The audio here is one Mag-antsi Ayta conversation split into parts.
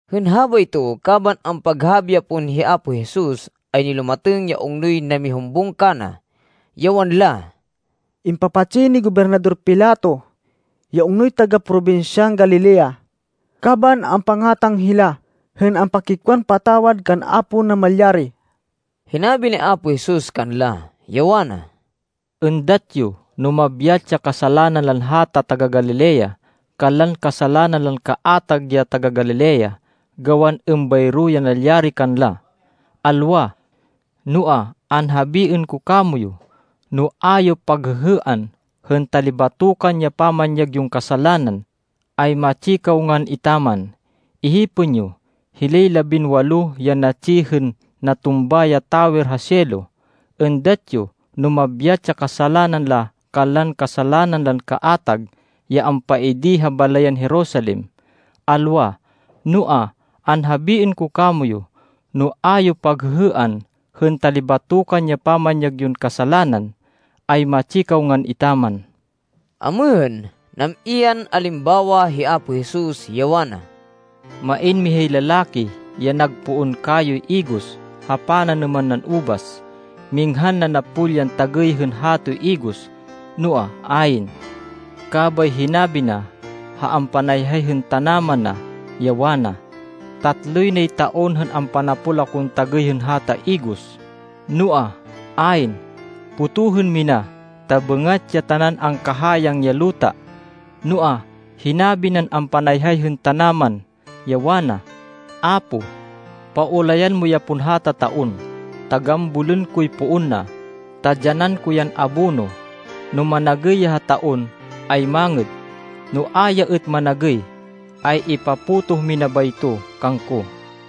Hên habayto, kaban ampaghabi ya pon hi Apo Jesus, ay nilumatêng ya ungnoy namihumbung kana, ya wanla, “Impapatsi ni Gobernador Pilato ya ungnoy taga-probinsyan Galilea kaban ampangátang hila hên ampakikwan patawad kan Apo Namalyari.” Hinabi ni Apo Jesus kanla, ya wana, “Êndat yo no mabyat ya kasalanan lan hata taga-Galilea kanlan kasalanan lan kaatag ya taga-Galilea, gawan êmbayro ya nalyari kanla? Alwa! Noa, anhabiên ko kamoyu, no a yo paghêhêan hên talibatokan ya pamanyag yon kasalanan, ay matsi kaw ngan etaman. Ihipên yo hilay labinwalo ya natsi hên natumba ya tawer ha Siloe. Êndat yo no mabyat ya kasalanan la kanlan kasalanan lan kaatag ya ampaidi ha balayan Jerusalem? Alwa! Noa, anhabiên ko kamoyu, no a yo paghêhêan hên talibatokan ya pamanyag yon kasalanan, ay matsi kaw ngan etaman.” Amêhên, nam-i yan alimbawa hi Apo Jesus, ya wana, “Main mihay lalaki ya nag poon kayoy igos ha pananêman nan ubas. Minghan nanapol yan tagêy hên hatoy igos, noa, ayn. Kabay hinabi na ha ampanayhay hên tanaman na, ya wana, ‘Tatloy nay taon hên ampanapol akon tagêy hên hata igos, noa, ayn. Potohên mina, ta bêngat ya tanan angkahayang ya luta.’ Noa, hinabi nan ampanayhay hên tanaman, ya wana, ‘Apo, paulayan mo ya pon hata taon, ta gambolên koy poon na, ta dyanan ko yan abono. No managêy ya ha taon, ay mangêd. No a ya êt managêy, ay ipapotoh mina bayto kangko.’”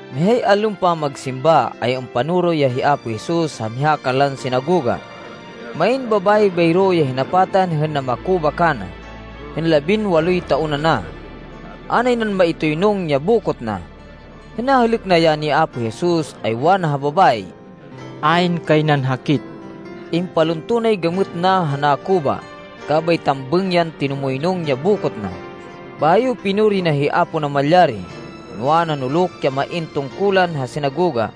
Mihay allon pamagsimba, ay ampanoro ya hi Apo Jesus ha miha kanlan sinagoga. Main babayi bayro ya hinapatan hên namakuba kana, hên labinwaloy taon ana. A nay nan maitoynung ya bokot na. Hên nahêlêk na ya ni Apo Jesus, ay wana ha babayi, “Ayn kay nan hakit!” Impalunto nay gamêt na ha nakuba, kabay tambêng yan tinumoynung ya bokot na, bayo pinuri na hi Apo Namalyari. Noa, nanuluk ya main tungkulan ha sinagoga,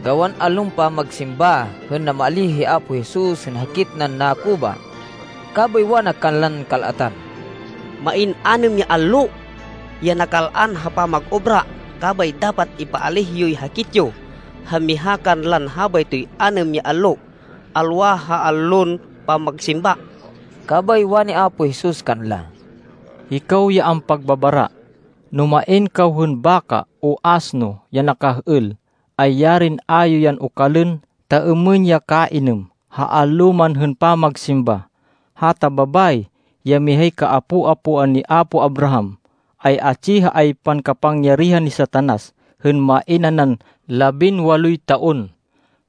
gawan allon pamagsimba, hên namaalíh hi Apo Jesus hên hakit nan nakuba. Kabay wana kanlan kal-atan, “Main anêm ya allo ya nakal-an ha pamag-obra. Kabay dapat ipaalíh yoy hakit yo ha miha kanlan habaytoy anêm ya allo, alwa ha allon pamagsimba.” Kabay wani Apo Jesus kanla, “Hikaw ya ampagbabara! No main kaw hên baka o asno ya nakah-êl, ay yarin a yo yan okalên ta êmên ya kainêm, ha allo man hên pamagsimba! Hata babayi, ya mihay kaapo-apoan ni apo Abraham, ay atsi ha aypan kapangyarihan ni Satanas hên main nanan labinwaloy taon,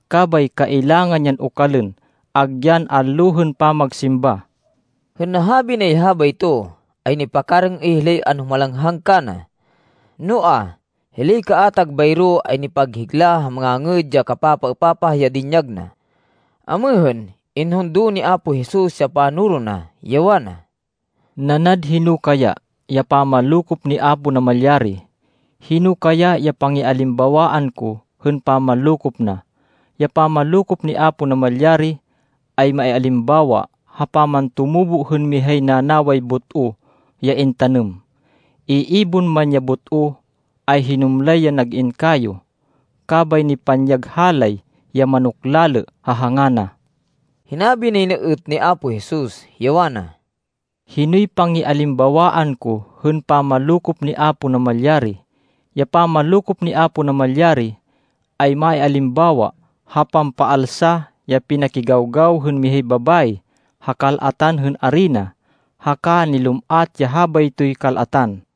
kabay kailangan yan okalên, agyan allo hên pamagsimba.” Hên nahabi nay habayto, ay nipakarêng-êy hilay anhumalanghang kana. Noa, hilay kaatag bayro ay nipaghigla ha mangangêd ya kapapaêpapah ya dinyag na. Amêhên, inhundo ni Apo Jesus ya panoro na, ya wana, “Nanad hino kaya ya pamanlokop ni Apo Namalyari? Hino kaya ya pangialimbawaan ko hên pamanlokop na? Ya pamanlokop ni Apo Namalyari ay maialimbawa ha pamantumubo hên mihay nanaway but-o ya intanêm. Iibon man ya but-o, ay hinumlay yan nag-in kayo, kabay nipanyag halay ya manok-lalê ha hanga na.” Hinabi nay na êt ni Apo Jesus, ya wana, “Hinoy pangialimbawaan ko hên pamanlokop ni Apo Namalyari? Ya pamanlokop ni Apo Namalyari ay maialimbawa ha pampaalsa ya pinakigawgaw hên mihay babayi ha kal-atan hên arina, haka nilum-at ya habaytoy kal-atan.”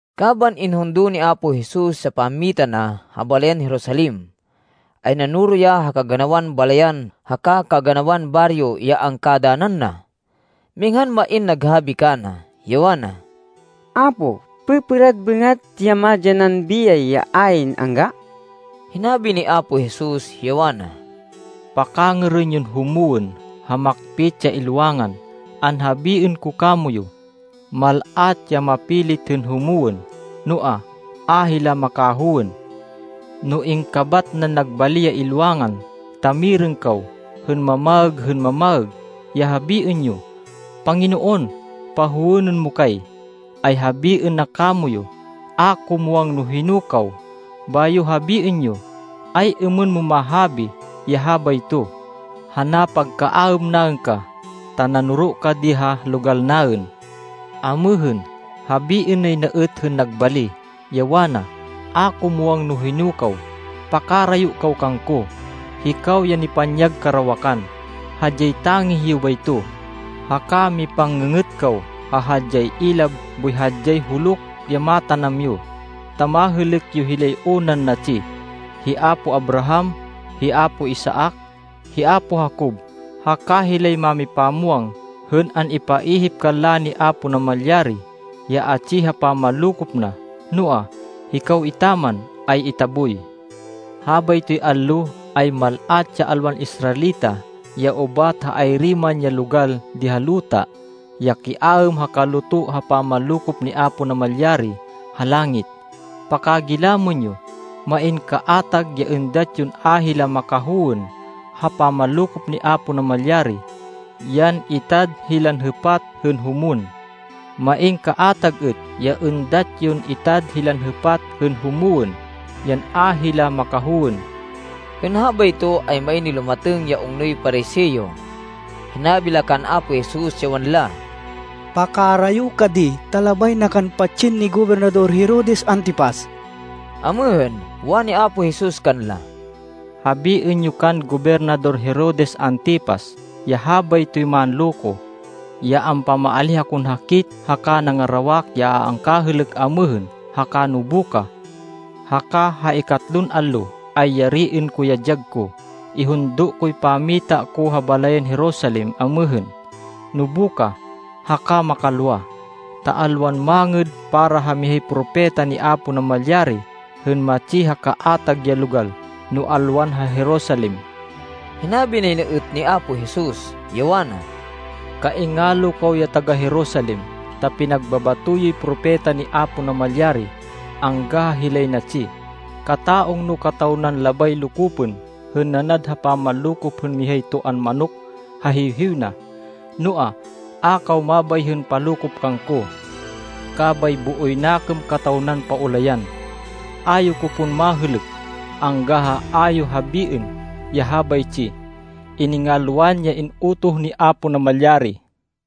Kaban inhundo ni Apo Jesus ya pammita na ha balayan Jerusalem, ay nanoro ya ha kaganawan balayan haka kaganawan baryo ya angkadanan na. Minghan main naghabi kana, ya wana, “Apo, pêpêrad bêngat ya madyanan biyay ya ayn angga?” Hinabi ni Apo Jesus, ya wana, “Pakangêrên yon humwên ha makpit ya ilwangan. Anhabiên ko kamoyu, mal-at ya mapilit hên humwên, noa, a hila makahowên. “No ingkabat nan nag bali ya ilwangan, ta mirêng kaw hên mamaêg hên mamaêg, ya habiên yo, ‘Panginoon pahowênên mo kay!’ ay habiên na kamoyu, ‘A ko muwang no hino kaw.’ Bayo habiên yo, ‘Ay-êmên mon mahabi ya habayto, ha napagkaaêm naên ka, ta nanoro ka di ha logal naên.’ Amêhên, habiên nay na êt hên nag bali, ya wana, ‘A ko muwang no hino kaw. Pakarayo kaw kangko, hikaw ya nipanyag karawakan.’ Hadyay tangih yo bayto, haka mipang-ngê-ngêt kaw ha hadyay ilab boy ha hadyay huluk ya matanam yo, ta mahêlêk yo hilay unan natsi, hi apo Abraham, hi apo Isaac, hi apo Jacob haka hilay mámipamwang hên an-ipaihip kanla ni Apo Namalyari ya atsi ha pamanlokop na, noa, hikaw etaman, ay itaboy. Habaytoy allo, ay mal-at ya alwan Israelita ya ubat ha ayri man ya logal di ha luta, ya kiaêm ha kaluto ha pamanlokop ni Apo Namalyari ha langit. Pakagilamên yo. Main kaatag ya êndat yon a hila makahowên ha pamanlokop ni Apo Namalyari, yan itad hilan hêpat hên humwên. Main kaatag êt ya êndat yon itad hilan hêpat hên humwên, yan a hila makahowên.” Hên habayto, ay main nilumatêng ya ungnoy Pariseo. Hinabi la kan Apo Jesus, ya wanla, “Pakarayo ka di, ta labay na kan patsên ni Gobernador Herodes Antipas.” Amêhên, wani Apo Jesus kanla, “Habiên yo kan Gobernador Herodes Antipas, ya habaytoy manloko, ya ampamaalíh akon hakit haka nangarawak ya a angkahêlêk amêhên haka nobukah. Haka ha ikatlon allo ay yariên ko ya dyag ko. Ihundo koy pammita ko ha balayan Jerusalem amêhên, nobukah haka makalwa, ta alwan mangêd para ha mihay propeta ni Apo Namalyari hên matsi ha kaatag ya logal no alwan ha Jerusalem.” Hinabi nay na êt ni Apo Jesus, ya wana, “Kaingalo kaw ya taga-Jerusalem, ta pinagbabato yoy propeta ni Apo Namalyari angga ha hilay natsi. Kata-ungno kataw nan labay lokopên hên nanad ha pamanlokop hên mihay toan manok ha hiwhiw na. Noa, a kaw mabay hên palokop kangko. Kabay booy nakêm kataw nan paulayan. A yo ko pon mahêlêk, angga ha a yo habiên ya habaytsi, ‘Iningalwan ya in-utoh ni Apo Namalyari.’”